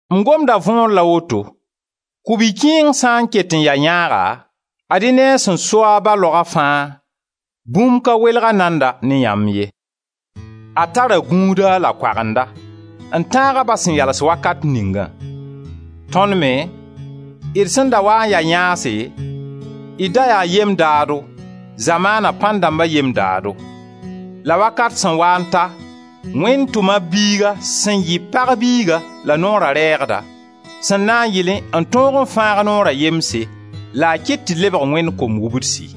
M gomda võor la woto: ku-bi-kẽeng sã n ket n ya yãaga, ad-y ne a sẽn so a ba laoga fãa, bũmb ka welg-a nanda ne yamb ye. A tara gũuda la koagenda, n tãag a ba sẽn yals wakat ningã. Tõnd me, d sẽn da waa n ya yãase d da yaa yem-daado, zamaana pãn-dãmba yem-daado. La wakat sẽn waa n ta, Wẽnd tʋma b Biiga sẽn yɩ pag biiga la noora rɛɛgda, sẽn na n yɩlẽ n tõog n fãag noora yemse, la a kɩt tɩ d lebg Wẽnd kom-wubdsi.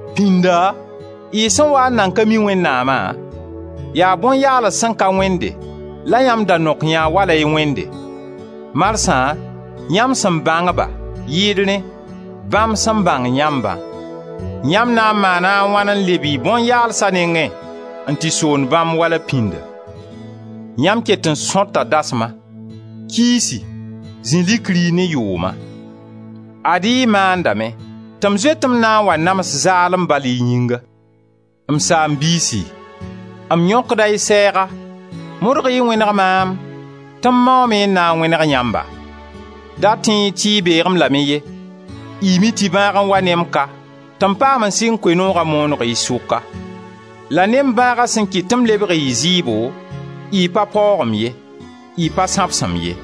Pĩnda, y sẽn waa n nan ka mi Wẽnnaama, yaa bõn-yaals sẽn ka wẽnde la yãmb da nok yã wala y wẽnde. Marsã, yãmb sẽn bãng-ba, yɩɩd rẽ, bãmb sẽn bãng yãmbã, yãmb na n maana a wãn n leb y bõn-yaalsa nengẽ n tɩ soond bãmb wala pĩndã? Yãmb ket n sõta dasma, kiisi, zĩ likri ne yʋʋma! Ad-y y maandame tɩ m zoet-m na n wa nams zaalem bal y yĩnga. M saam-biisi, m yõkda y sɛɛga, modg-y n wẽneg maam tɩ m maoome n na n wẽneg yãmba. Da tẽ-y tɩ y beeg-m lame ye. Y mi tɩ bãag n wa ne m ka tɩ m paam n sɩng Koe-nooga mooneg y sʋka. La ne m bãaga sẽn kɩt tɩ m lebg y zɩɩbo, y pa paoog-m ye, y pa sãbs-m ye;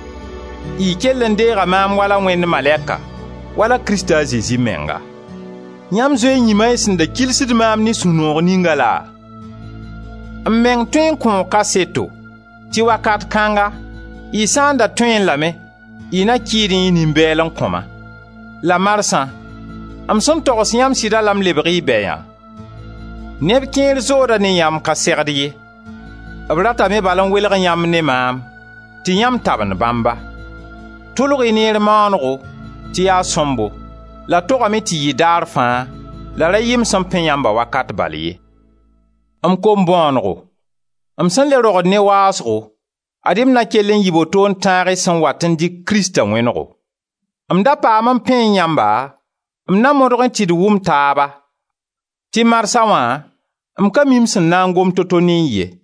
y kell n deega maam wala Wẽnd malɛka, wala Krista a Zezi menga. Yãmb zoe n yĩma y sẽn da kilsd maam ne sũ-noog ninga laa? M meng tõe n kõo kaseto tɩ wakat kãnga, y sã n da tõee lame, y na kɩɩdẽ y nin-bɛɛl n kõ-ma. La marsã m sẽn togs yãmb sɩda la m lebg y bɛya? Neb kẽer zooda ne yãmb ka segd ye. B ratame bal n welg yãmb ne maam tɩ yãmb tabend bãmba. Tʋlg-y neer maanego tɩ yaa sõmbo, la togame tɩ yɩ daar fãa, la ra yɩ m sẽn pẽ yãmba wakat bal ye. M kom-bõonego, m sẽn le rogd ne waasgo, ad-y na n kell n yɩɩ boto n tãag y sẽn wat n dɩk Krista wẽnego. M da paam n pẽẽ yãmba m na modgẽ tɩ d wʋm taaba tɩ marsã wã m ka mi m sẽn na m gom to-to ne y ye.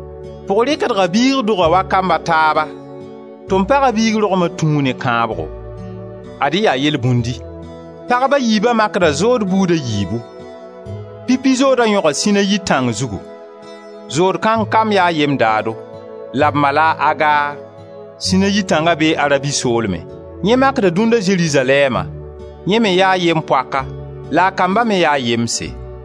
Pʋg rɩkra biig doga wa kamb a taaba; tom paga biig rogma tũu ne kãabgo. Ad-y yaa yelbũndi: pagb a yiiba makda zood buud a yiibu. Pipi zooda yõga Sinayi tãng zugu; zood kãng kamb yaa yem-daado, la b ma la a Agar. (Sinayi tãnga bee Arabi soolmẽ) Yẽ makda dũnna Zerizalɛɛma, yẽ me yaa yem-poaka la a kamba me yaa yemse.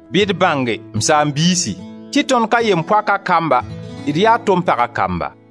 Bɩ d bãnge, m saam-biisi, tɩ tõnd ka yem-poaka kamba, d yaa tom paga kamba.